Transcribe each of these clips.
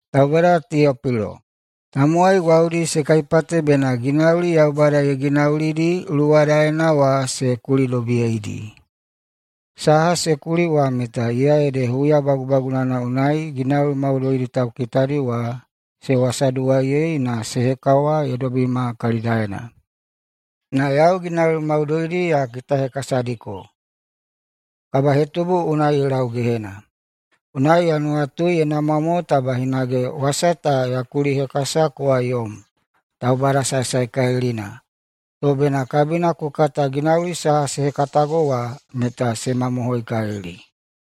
Taubada Teopilo! Tamowai gwaudi se kaipate bena ginauli Yaubada ye ginaulidi luwadaena wa se kulidobiyeidi. Saha se kuli wa meta iya ede huya bagubagunana unai ginauli maudoidi taukitadi wa se wasaduwaiyei na se hekawa ye dobima kalidaena. Na yau ginauli maudoidi ta ya kitahekasadiko, kabahetubu unai ye lau gehena. Unai ya nuwatui ye namwa mo taba yau hinage wasa ta ya kulihekasa kowa yom, taubada saesaekalilina, to bena kabina ku kata ginauli saha se hekatago wa meta se mamohoikalili.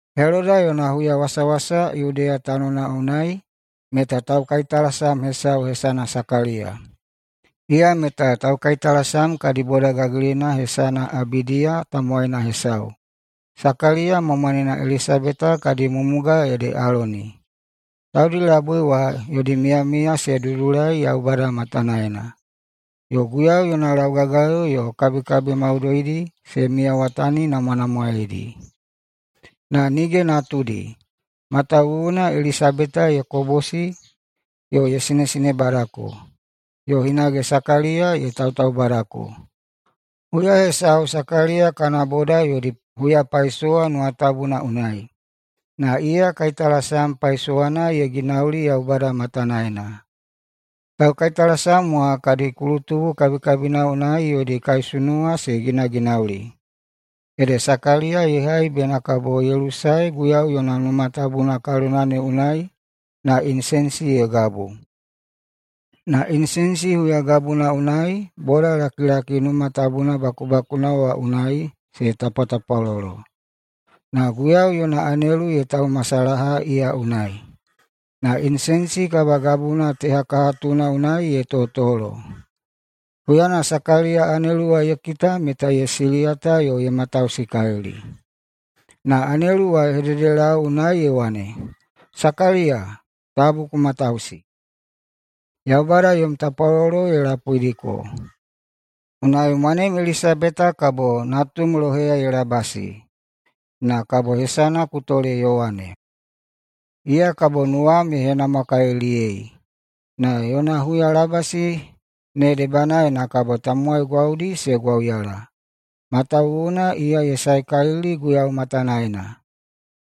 Heloda yona huyawasawasa Yudeya tanona unai meta taukaitalasam hesau hesana Sakaliya. Iya meta taukaitalasam kadi boda gagilina hesana Abidiya tamowaina hesau. Sakaliya ma mwanena Elisabeta kadi mumuga ede Aloni. Taudi labui wa yodi miyamiya se dudulai Yaubada matanaena, yo Guiyau yona laugagayo yo kabikabi maudoidi se miyawataninamwanamwaedi. Na nige natudi, matawuwuna Elisabeta ye kobosi yo ye sinesinebadako, yo hinage Sakaliya ye tautaubadako. Huya hesau Sakaliya kana boda yodi huyapaisowa Numa Tabuna unai, na iya kaitalasam paisowana ye ginauli Yaubada matanaena. Taukaitalasam wa kadi kulutubu kabikabina unai yodi kaisunuwa se ginaginauli, ede Sakaliya ye hai bena kabo ye lusae Guiyau yona Numa Tabuna kalona ne unai na inisenisi ye gabu. Na inisenisi huyagabuna unai bodalakilaki Numa Tabuna bakubakuna wa unai se tapwatapwalolo. Na Guiyau yona anelu ye taumasalaha iya unai, na inisenisi kabagabuna tehakahatuna unai ye totolo. Huyana Sakaliya anelu wa ye kita meta ye siliyata yo ye matausikalili. Na anelu wa ye hededelau unai ye wane, “Sakaliya, tabu ku matausi! Yaubada yom tapwalolo ye lapuidiko. Unai mwanem Elisabeta kabo natumiu loheya ye labasi, na kabo hesana ku tole Yowane. Iya kabo nuwam ye henamwakaliliyei, na yona huyalabasi ne debanaena kabo tamowai gwaudi se gwauyala, matawuwuna iya meta ye saekalili Guiyau matanaena.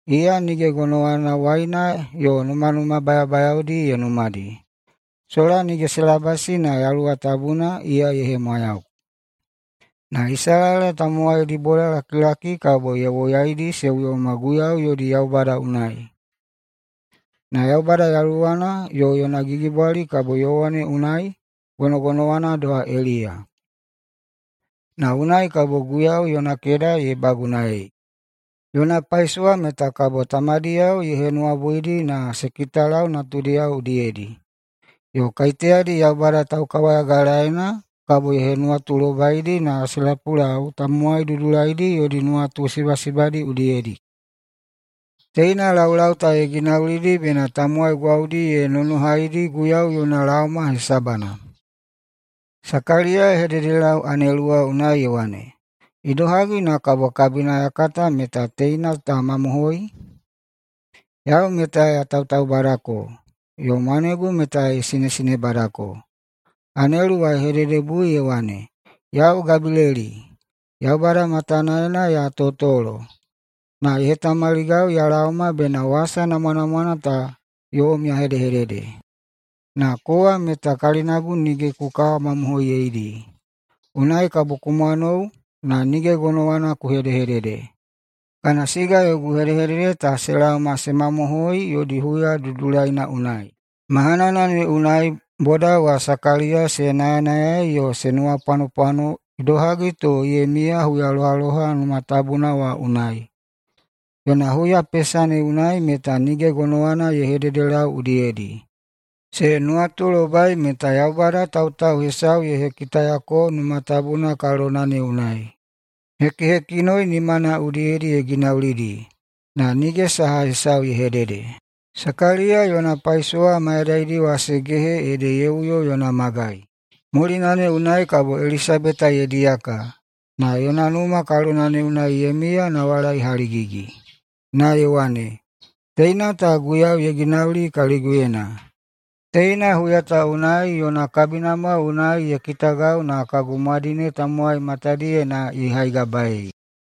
Iya nige gonowana waina yo numanuma bayabayaodi ye numadi. Sola nige se labasi na Yaluwa Tabuna iya ye hemwayau. Na Isalaela tamowaidi bodalakilaki kabo ye woyaidi se uyoma Guiyau yodi Yaubada unai. Na Yaubada yaluwana yo yona gigibwali kabo Yowane unai gonogonowana doha Eliya, na unai kabo Guiyau yona keda ye bagunaei. Yona paisowa meta kabo tamadiyao ye henuwabuidi na se kitalau natudiyao udiyedi, yo kaiteyadi Yaubada taukawayagalaena kabo ye henuwatulobaidi na se lapulau tamowai dudulaidi yodi nuwatu sibasibadi udiyedi. Teina laulau ta ye ginaulidi bena tamowai gwaudi ye nonohaidi Guiyau yona laoma hesabana.” Sakaliya ye hededelau anelu wa unai ye wane, “Idohagi na kabo kabina ya kata meta teina ta mamohoi? Yau meta ya tautaubadako, yo mwanegu meta ye sinesinebadako.” Anelu wa ye hededebui ye wane, “Yau Gabileli, Yaubada matanaena ya totolo, na ye hetamaligau ya laoma bena wasa namwanamwana ta yom ya hedehedede. Na kowa meta kalinagu nige ku kawamamohoiyeidi, unai kabo ku mwanou na nige gonowana ku hedehedede, kana siga yogu hedehedede ta se laoma se mamohoi yodi huya dudulaina unai.” Mahanana ne unai boda wa Sakaliya se nayanayai yo se nuwapwanopwano idohagi to ye miya huyalohaloha Numa Tabuna wa unai. Yona huyapesa ne unai meta nige gonowana ye hedehededelau udiyedi. Se nuwatulobai meta Yaubada tautau hesau ye hekitayako Numa Tabuna kalona ne unai. Hekihekinoi nimana udiyedi ye ginaulidi, na nige saha hesau ye hedede. Sakaliya yona paisowa mayadaidi wa se gehe ede ye uyo yona magai. Mulina ne unai kabo Elisabeta ye diyaka, na yona numa kalona ne unai ye miya nawalai haligigi, na ye wane, “Teina ta Guiyau ye ginauli kaliguyena! Teina huya ta unai yona kabinamwa unai ye kitagau na kagu mwadine tamowai matadiyena ne ye haigabaei.”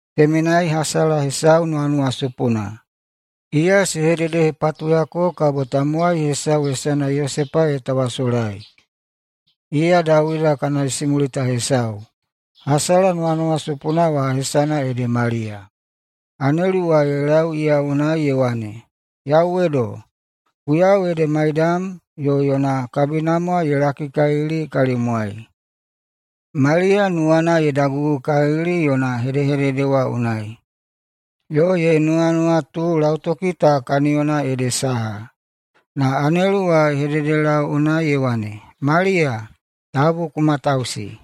Temenai hasala hesau nuwanuwasupuna. Iya se hededehepatuyako bena kabo tamowai hesau hesana Yosepa ye tawasolai, iya Dawida kana isimulita hesau. Hasala nuwanuwasupuna wa hesana ede Maliya. Anelu wa ye lau iya unai ye wane, “Yauwedo! Guiyau ede maiyam yo yona kabinamwa ye lakikalili kalimwai.” Maliya nuwana ye dagugukalili yona hedehedede wa unai, yo ye nuwanuwatu lautoki ta kaniyona ede saha. Na anelu wa ye hededelau unai ye wane, “Maliya, tabu ku matausi!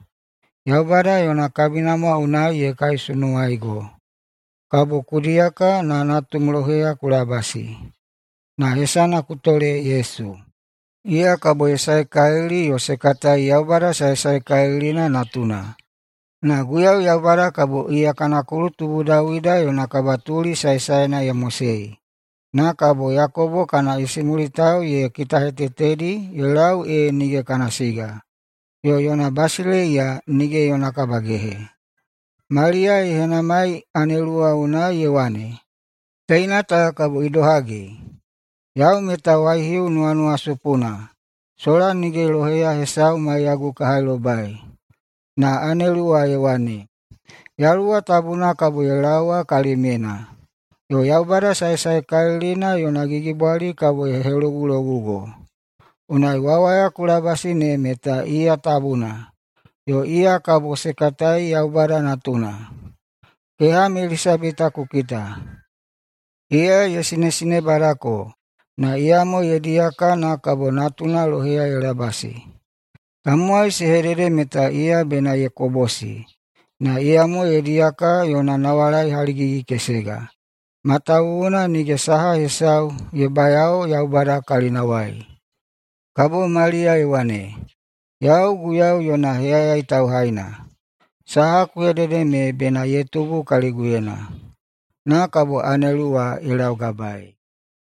Yaubada yona kabinamwa unai ye kaisunuwaigo. Kabo ku diyaka na natum loheya ku labasi, na hesana ku tole Yesu. Iya kabo ye saekalili yo se katai Yaubada Saesaekalilina Natuna. Na Guiyau Yaubada kabo iya kana kulutubu Dawida yona kabatuli saesaena ye mosei, na kabo Yakobo kana isimulitao ye kitahetetedi ye lau ee nige kana siga, yo yona basileiya nige yona kabagehe.” Maliya ye henamai anelu wa unai ye wane, “Teina ta kabo idohagi? Yau meta waihiu nuwanuwasupuna, sola nige loheya hesau maiyagu ka hailobai.” Na anelu wa ye wane, “Yaluwa Tabuna kabo ye laowa kalimyena, yo Yaubada Saesaekalilina yona gigibwali kabo ye helogulogugo. Unai wawaya ku labasi ne meta iya Tabuna, yo iya kabo se katai Yaubada Natuna. Keham Elisabeta ku kita! Iya ye sinesinebadako na iyamo ye diyaka na kabo natuna loheya ye labasi. Tamowai se hedede meta iya bena ye kobosi, na iyamo ye diyaka yona nawalai haligigi-kesega. Matawuwuna nige saha hesau ye bayao Yaubada kalinawai.” Kabo Maliya ye wane, “Yau Guiyau yona heyayai tauhaina. Saha ku hedede me bena ye tubu kaliguyena.” Na kabo anelu wa ye laugabaei.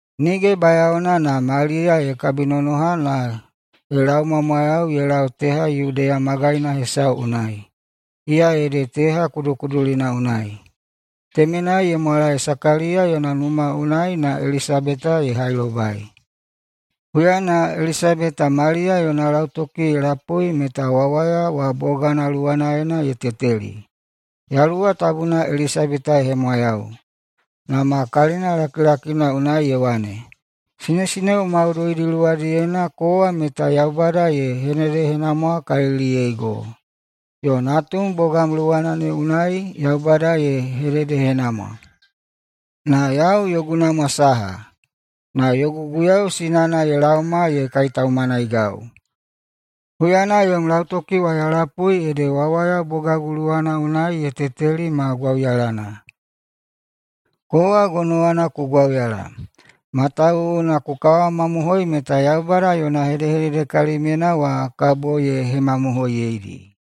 Nige bayaona na Maliya ye kabinonoha na ye laumwamwayau ye lau teha Yudeya magaina hesau unai, iya ede teha kudukudulina unai. Temenai ye mwalae Sakaliya yona numa unai na Elisabeta ye hailobai. Huyana Elisabeta Maliya yona lautoki ye lapui meta wawaya wa bogana luwanaena ye teteli. Yaluwa Tabuna Elisabeta ye hemwayau, na ma kalina lakilakina unai ye wane, “Sinesineo maudoidi luwadiyena kowa meta Yaubada ye hededehenamwakaliliyeigo, yo natum bogam luwanaena ne Yaubada ye hededehenamwa! Na yau yogu namwa saha, na yogu Guiyau sinana ye laoma ye kaitaumanaigau! Huyana yom lautoki wa ya lapui ede wawaya bogagu luwana unai ye teteli ma gwauyalana. Kowa gonowana ku gwauyala, matawuwuna ku kawamamohoi meta Yaubada yona hedehedede kalimyena wa kabo ye hemamohoiyeidi.”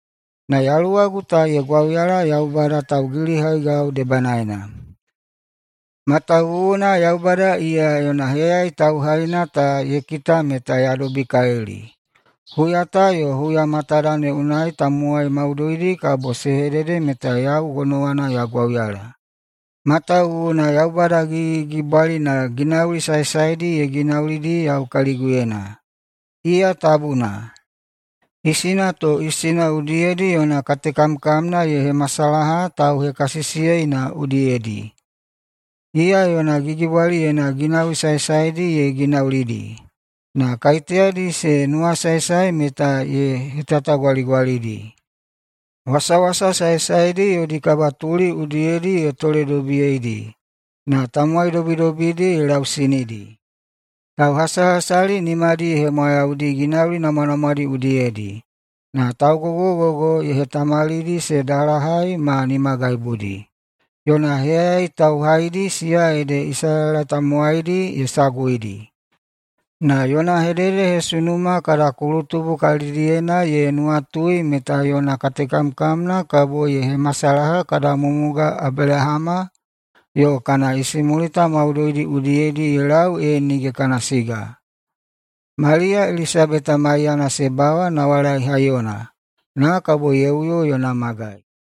na yaluwagu ta ye gwauyala Yaubada taugilihaigau debanaena, matawuwuna Yaubada iya yona heyayai tauhaina ta ye kita meta ya dobikalili. Huya ta yo huya matada ne unai tamowai maudoidi kabo se hedede meta yau gonowana ya gwauyala, matawuwuna Yaubada Gigigigibwalina ginauli saesaedi ye ginaulidi yau kaliguyena. Iya tabuna. Isina to isina udiyedi yona katekamkamna ye hemasalaha tauhekasisiyeina udiyedi. Iya yona gigibwaliyena ginauli saesaedi ye ginaulidi, na kaiteyadi se nuwasaesae meta ye hetatagwaligwalidi. Wasawasa saesaedi yodi kabatuli udiyedi ye toledobiyeidi, na tamowai dobidobidi ye lausinidi. Tauhasahasali nimadi ye hemwayaudi ginauli namwanamwadi udiyedi, na taugogogogo ye hetamalidi se dalahai ma nimagaibudi. Yona heyayai tauhaidi, siya ede Isalaela tamowaidi, ye saguidi, na yona hededehesunuma kada kulutubu kalidiyena ye nuwatui meta yona katekamkamna kabo ye hemasalaha kada mumuga Abelahama yo kana isimulita maudoidi udiyedi ye lau ee nige kana siga.” Maliya Elisabeta maiyana se bawa nawalai haiyona, na kabo ye uyo yona magai.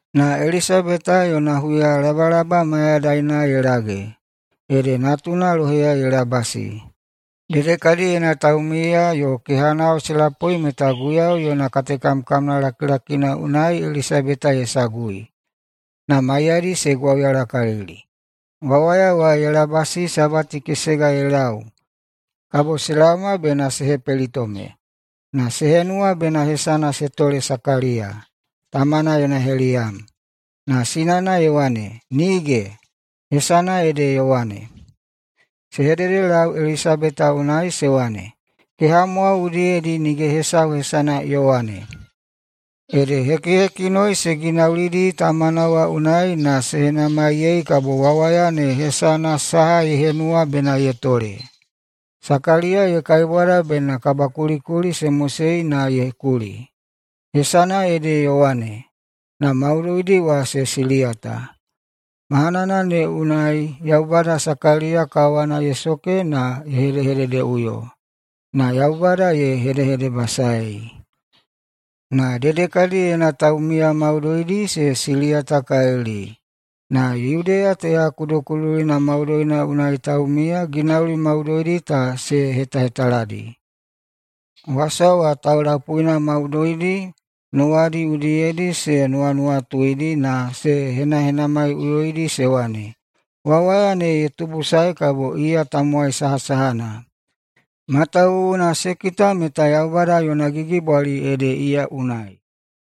Na Elisabeta yona huyalabalaba mayadaina ye lage, ede natuna loheya ye labasi. Dedekadiyena taumiya yo kehanao se lapui meta Guiyau yona katekamkamna lakilakina unai Elisabeta ye sagui, na maiyadi se gwauyalakalili. Wawaya wa ye labasi sabati kesega ye lau kabo se laoma bena se hepelitome. Na se henuwa bena hesana se tole Sakaliya, tamana yona heliyam. Na sinana ye wane, “Nige! Hesana ede Yowane.” Se hededelau Elisabeta unai se wane, “Kehamwao udiyedi nige hesau hesana Yowane!” Ede hekihekinoi se ginaulidi tamana wa unai na se henamaiyei kabo wawaya ne hesana saha ye henuwa bena ye tole. Sakaliya ye kaibwada bena kabakulikuli se mosei na ye kuli, “Hesana ede Yowane.” Na maudoidi wa se siliyata. Mahanana ne unai Yaubada Sakaliya kawana ye soke na ye hedehededeꞌuyo, na Yaubada ye hedehedebasaei. Na dedekadiyena taumiya maudoidi se siliyatakalili, na Yudeya teha kudukudulina maudoina unai taumiya ginauli maudoidi ta se hetahetaladi. Wasa wa taulapuina maudoidi nuwadi udiyedi se nuwanuwatuidi na se henahenamaiꞌuyoidi se wane, “Wawaya ne ye tubusae kabo iya tamowai sahasahana?” Matawuwuna se kita meta Yaubada yona gigibwali ede iya unai.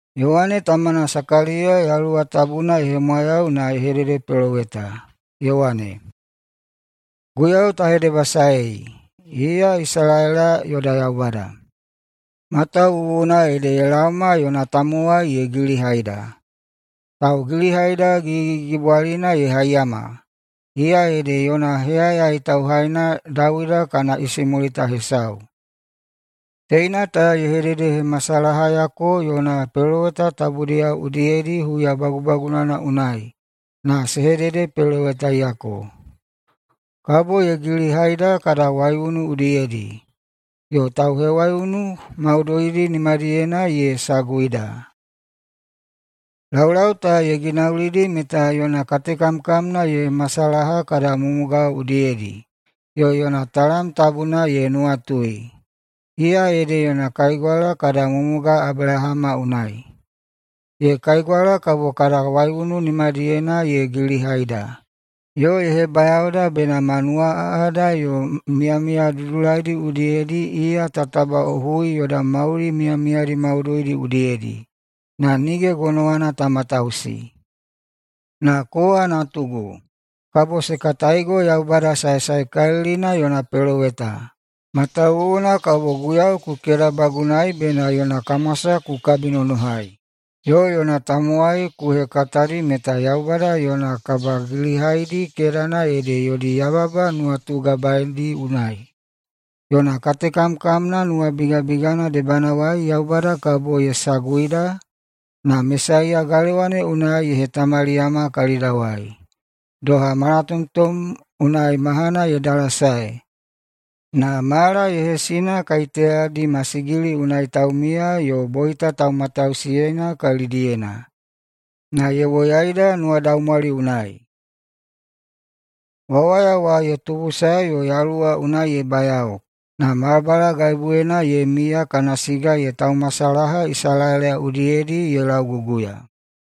Yowane tamana Sakaliya Yaluwa Tabuna ye hemwayau na ye hededepeloweta, ye wane, “Guiyau ta hedebasaei, iya Isalaela yoda Yaubada! Matawuwuna ede ye laoma yona tamowai ye gilihaida. Taugilihaida gigigigibwalina ye haiyama, iya ede yona heyayai tauhaina Dawida kana isimulita hesau. Teina ta ye hededehemasalahayako yona peloweta tabudiyao udiyedi huya bagubagunana unai na se hededepelowetaiyako. Kabo ye gilihaida kada waiunu udiyedi, yo tauhewaiunu maudoidi nimadiyena ye saguhaida. Laulau ta ye ginaulidi meta yona katekamkamna ye hemasalaha kada mumuga udiyedi yo yona talam tabuna ye nuwatui, iya ede yona kaigwala kada mumuga Abelahama unai. Ye kaigwala kabo kada waiunu nimadiyena ye gilihaida, yo ye hebayaoda bena ma nuwaꞌaꞌada yo miyamiya dudulaidi udiyedi iya ta tabaꞌohui yoda mauli mayadaidi maudoidi udiyedi, na nige gonowana ta matausi. Na kowa, natugu, kabo se kataigo Yaubada Saesaekalilina yona peloweta, matawuwuna kabo Guiyau ku kedabagunaei bena yona kamwasa ku kabinonohai, yo yona tamowai ku hekatadi meta Yaubada yona kabagilihaidi kedana ede yodi yababa nuwatugabaedi unai. Yona katekamkamna nuwabigabigana debanawai Yaubada kabo ye saguida na Mesaiya galewa ne unai ye hetamaliyama kalidawai doha malatomtom unai mahana ye dalasae, na mala ye hesina kaiteyadi masigili unai taumiya yo boita taumatausiyeina kalidiyena, na ye woyaida nuwadaumwali unai.” Wawaya wa ye tubusae yo yaluwa unai ye bayao, na balabalagaibuyena ye miya kana siga ye taumasalaha Isalaela udiyedi ye lauguguya.